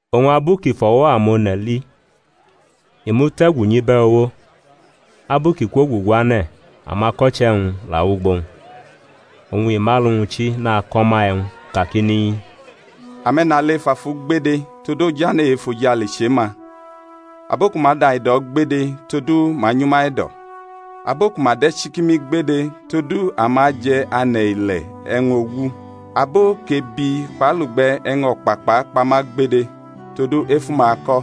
Oñ abu kʼi fʼo̩wo̩ amone̩ li, i mute̩gu nyʼibe̩ uwo; abu kʼi kwoguguane̩, amako̩che̩-wñ la wʼugbo-wñ. Oñ i mʼalu-wñ chi nako̩ ma e̩wñ kakini: Ame̩nale ef afu gbede, todu ojane̩ e-efojale chʼe-ma. Abo ku ma daido̩ gbede, todu ma anyʼuma e̩do̩. Abo ku ma de̩ chikimi gbede, todu ama aje̩ ane̩ ile̩ e̩wñ ogu. Abo kʼebi kpʼalugbe̩ e̩wñ o̩kpakpa akpa ma gbede, todu efu-ma ako̩.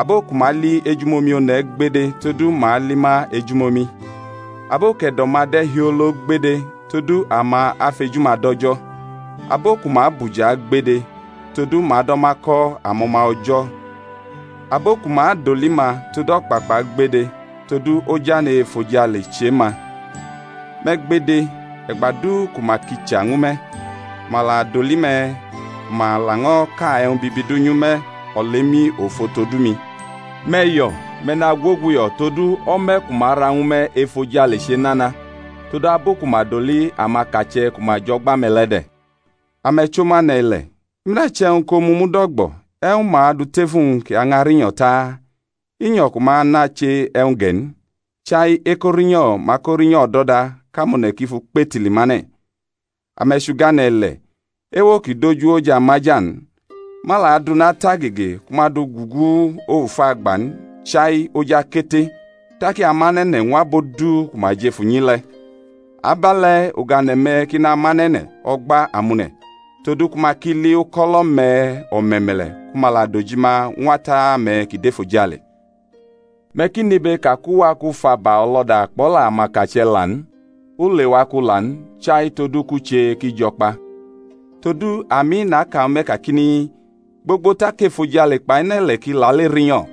Abo ku ma li ejumomi one̩ gbede, todu ma ali ma ejumomi. Abo kʼe̩do̩-ma de̩ hiolo gbede, todu ama afʼeju-ma dʼO̩jo̩. Abo ku ma bʼuja gbede, todu ma ado̩ ma ko̩ amo̩ma O̩jo̩. Abo ku ma doli ma tod o̩kpakpa gbede, todu ojane̩ e-efojale chʼe-ma. Me̩ gbede, e̩gba du ku ma kicha ñwu me̩, ku ma doli me̩ ku ma laño̩ ka e̩wñ bibi du nyʼume̩ olemi ofo todu mi. Me̩ yo̩; me̩ nagwoguyo̩; todu o̩me̩ ku ma ara ñwu me̩ efojale chenana; todu abu ku ma doli amakache̩ ku ma jʼo̩gba-me̩ le̩ de̩. Ame̩ chʼomu ane̩-ile̩. I muda che̩wñ kʼomu mud o̩gbo̩, e̩wñ ma adu tʼef uwñ kʼi ñʼarinyo̩ ta? I nyo̩ ku ma nʼache e̩wñ ge̩ n, chai ekorinyo̩ ma akorinyo̩ o̩do̩da kʼamone̩ ki fʼu kpetili mʼane̩. Ame̩ chʼugane̩ ile̩. Ewo ki dʼoj uwo jʼamaja n. Ma la adʼuna tʼagege ku ma dʼu gugu of agba n, chai oj akete; tak i amʼane̩ ne̩ ñw abo du ku ma jʼef unyi le̩. Abe̩le̩ ugane̩-me̩ ki namʼane̩ ne̩ o̩gba amone̩, todu ku ma ki li uko̩lo̩-me̩ o̩me̩me̩le̩, ku ma la dʼojima ñw Ata-me̩ kʼi dʼefojale. Me̩ ki nʼibe ka kʼu wa kʼu fʼaba o̩lo̩da kpʼo̩la amakache̩ la n; u lewa kʼu la n, chai todu kʼu che kʼi jo̩ kpa. Todu, ami, naka ñwu me̩ kakini, Gbogbo tak efojale kpʼane̩-ile̩ ki lale rinyo̩,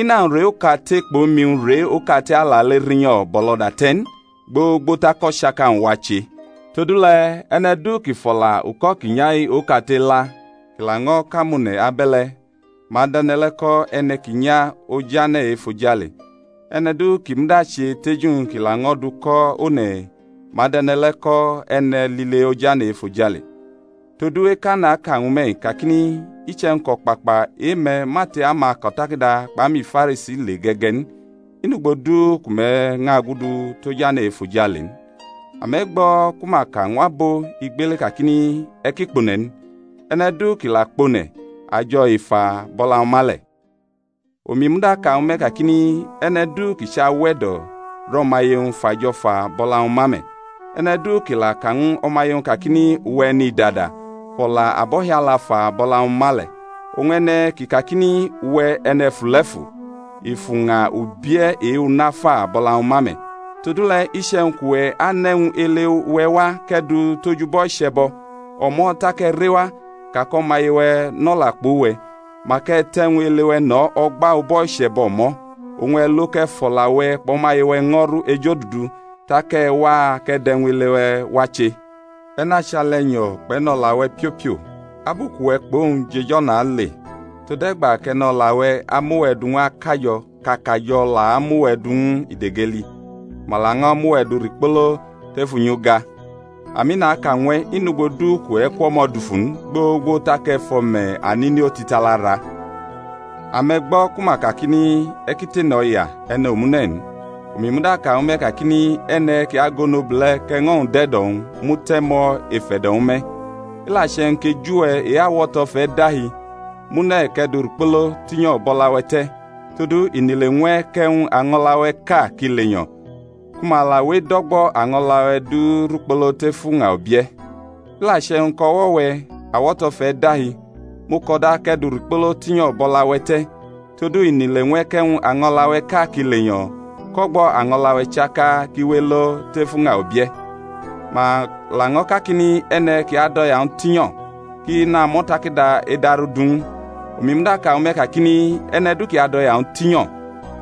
ina-wñ re okate kpʼomi-wñ re okate alale rinyo̩ bʼo̩lo̩da te̩ n, gbogbo tak o̩chaka-wñ wache. Todule̩ e̩ne̩ du ki fʼo̩la uko̩ ki nya-i okate la, kʼi laño̩ kʼamone̩ abe̩le̩, ma adʼe̩ne̩ le̩ ko̩ e̩ne̩ ki nya ojane̩ e-efojale; e̩ne̩ du ki muda che teju-wñ kʼi laño̩ dʼu ko̩ one̩, ma adʼe̩ne̩ le̩ ko̩ e̩ne̩ lile ojane̩ efojale. Todu eka naka ñwu me̩-i kakini, Iche̩wñ kʼo̩kpakpa e-me̩ ma tʼe-amako̩takada kpʼe-amiFarisi le ge̩-ge̩ n, i nʼugbo du ku me̩ ñʼagudu tʼojane̩ e-efojale n. Ame̩ gbo̩ ku ma ka ñw abo igbele kakini, E̩ ki kpone̩ n; e̩ne̩ du kʼi la kpone̩, ajo̩ i fa bʼo̩la-wñ ma le̩. Omi muda ka ñwu me̩ kakini, E̩ne̩ du kʼi chʼawe̩do̩ rʼo̩maye-wñ, fʼajo̩ fa bʼo̩la-wñ ma me̩; e̩ne̩ du kʼi la ka ñw o̩maye-wñ kakini, Uwe̩ e̩nidada, fʼo̩la abo̩hiala fa bʼo̩la-wñ ma le̩; oñ e̩ne̩ kʼi kakini, Uwe̩ e̩ne̩fule̩fu! i fʼuña ubie̩ e-una fa bʼo̩la-wñ ma me̩. Todule̩ iche̩wñ kʼuwe̩ anʼe̩wñ ele-we̩ wa kʼe̩ dʼu tʼoj ubo̩ iche̩bo̩, o̩mo̩ tak e̩ rewa ka kʼo̩maye-we̩ nʼo̩la kpʼuwe̩, mak e̩ tʼe̩wñ ele-we̩ no̩ o̩gba ubo̩ iche̩bo̩ o̩mo̩, oñ e̩ lo kʼe̩ fʼo̩la-we̩ kpʼo̩maye-we̩ ño̩ru ejodudu, tak e̩ wa kʼe̩ dʼe̩wñ ele-we̩ wa che. E̩ nachʼali e̩nyo̩ kpʼe̩no̩la-we̩ piopio abu kʼuwe̩ kpʼowñ jʼej o̩na ale, tode̩gba kʼe̩no̩la-we̩ amʼuwe̩ du ñw akajo̩ kʼakajo̩ la amʼuwe̩ du ñw idegeli, ku ma laño̩ mʼuwe̩ du rikpolo tef unyiuga; ami, naka ñwe̩, inʼugbo du kʼe̩ kwʼo̩mo̩ dufu n gbogbo tak e̩ fʼo̩me̩ anini otitala ra. Ame̩ gbo̩ ku ma kakini, E̩ ki tene o̩ya e̩ne̩ omune̩ n. Omi muda ka ñwu me̩ kakini, E̩ne̩ kʼi agʼonobule̩ kʼe̩ño̩-wñ dʼe̩do̩-wñ, mu te̩ mʼo̩ ef e̩do̩-wñ me̩. I la che̩wñ kʼeju-we̩ e-awo̩to̩ fʼe̩ dahi, mʼu ne̩ kʼe̩ dʼu rikpolo tinyo̩ bʼo̩la-we̩ te̩; todu i nʼile ñw e̩ kʼe̩wñ año̩la-we̩ʼka kʼi lenyo̩, ku ma la we edʼo̩gbo̩ año̩la-we̩ du rikpoʼo̩ tef uña ubie̩. I la che̩wñ kʼo̩wo̩-we̩ awo̩to̩ fʼe̩ dahi, mʼu ko̩da kʼe̩ dʼu rikpolo tinyo̩ bʼo̩la-we̩ te̩; todu i nʼile ñw e̩ kʼe̩wñ año̩la-we̩ʼka kʼi lenyo̩ kʼo̩gbo̩ año̩la-we̩ chaka kʼi we elo tef uña ubie̩. Ma laño̩ kakini, E̩ne̩ ki adʼo̩ya-wñ tinyo̩ kʼi namʼo̩takada e̩daru du ñw u; omi muda ka ñwu me̩ kakini, E̩ne̩ du kʼi adʼoya-wñ tinyo̩,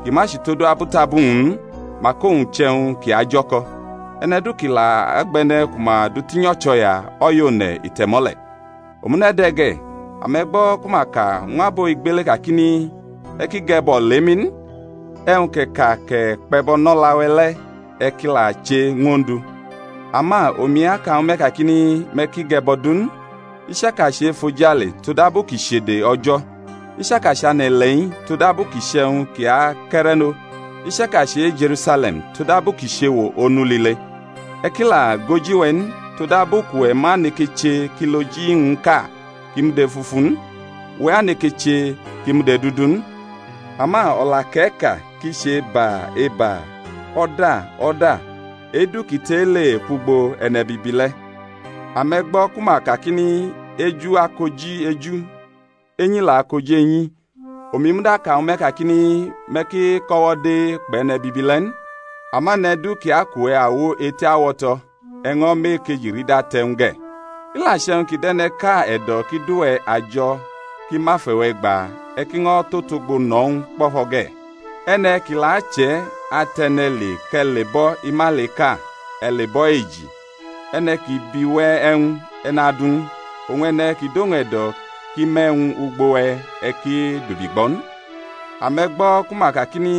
ki ma chʼutodu abutabu-wñ n, mak owñ chʼe̩wñ kʼi ajo̩ko̩. E̩ne̩ du kʼi la gbʼe̩ne̩ ku ma du tinyo̩ chʼo̩ya, o̩ya one̩ i te̩mʼo̩ le̩. Omune̩ de̩ ge̩: ame̩ gbo̩ ku ma ka ñw abo igbele kakini, E̩ ki ge̩bo̩ o̩lemi n, e̩wñ kʼe̩ ka kʼe̩ kpe̩bo̩ nʼo̩la-we̩ le̩, e̩ ki la che ñw Ondu. Ama omi aka ñwu me̩ kakini, Me̩ ki ge̩bo̩ du n, i chaka chʼe-efojale, todabu kʼi chʼede O̩jo̩, i chaka chʼane̩-ile̩-i, todabu ki chʼe̩wñ kʼi akʼe̩re̩ no, i chaka chʼe-Je̩rusale̩m, todabu kʼi chʼewo Onu lile. E̩ ki la gʼoji-we̩ n, todabu kʼuwe̩ ma neke che kʼiloji-wñʼka kʼi mud efufu n, uwe̩ aneke che kʼi mud edudu n. Ama o̩la kʼe̩ ka kʼi chʼEba, eba; O̩da, o̩da; e-du kʼi tʼe-i le kwʼugbo e̩ne̩bibi le̩. Ame̩ gbo̩ ku ma kakini, Eju akoji eju, enyi la akoji enyi. Omi muda ka ñwu me̩ kakini, Me̩ ki ko̩wo̩de kpʼe̩ne̩bibi le̩ n; ama e̩ne̩ du kʼi akʼuwe̩ awo eti awo̩to̩, e̩ ño̩ mʼe-ekeji rida te̩ ñw u ge̩; i la che̩wñ ki dʼe̩ne̩ʼka e̩do̩ kʼi dʼuwe̩ ajo̩ kʼi mʼafe̩-we̩ gba, e̩ ki ño̩ tʼotogbo no̩ ñw u kpo̩fo̩ ge̩; e̩ne̩ kʼi la achʼe̩ atʼe̩ne̩ le kʼe̩ lebʼo̩ imailiʼka, e̩ lebʼo̩ eji. E̩ne̩ kʼi bi we̩ e̩wñ, e̩ nadʼu ñw u; oñ e̩ne̩ kʼi dʼowñ e̩do̩ kʼi me̩ e̩wñ ugbo we̩, e̩ ki dubigbʼo̩ n. Ame̩ gbo̩ ku ma kakini,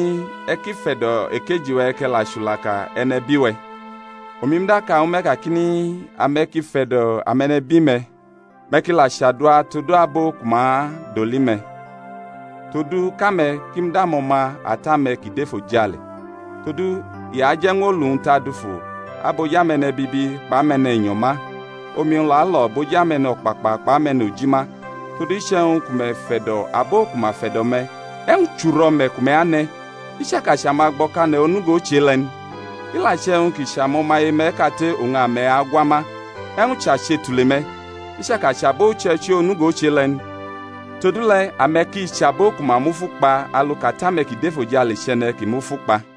E̩ ki fe̩do̩ ekeji-we̩, kʼe̩ la chulaka e̩nebi-we̩. Omi muda ka ñwu me̩ kakini, Ame̩ ki fe̩do̩ ame̩nebi-me̩, me̩ ki la chadua tod abo ku ma doli me̩, todu kʼame̩ ki mud amo̩ma Ata-me̩ kʼi dʼefojale; todu i aje̩ ñw olu-wñ tadufu abʼoj ame̩ne̩bibi kpʼame̩ne̩nyo̩ ma, omi-wñ la alo̩ bʼoji ame̩no̩kpakpa kpai ame̩nuji ma. Todu iche̩wñ ku me̩ fe̩do̩ abo ku ma fe̩do̩ me̩, e̩wñ chʼuro̩me̩ ku me̩ ane̩? I chaka chʼamagbo̩kane̩ onugo chʼe-le̩ n? I la che̩wñ kʼi chʼamo̩maye-me̩ kate oñ ame̩ agwa ma, e̩wñ chʼache tule-me̩? I chaka chʼabo uche̩ichi onugo chʼe-le̩ n? Todule̩ ame̩ ki chʼabo ku ma mufu kpa alu kʼAta-me̩ kʼi dʼefojale chʼE̩ne̩ ki mufu kpa.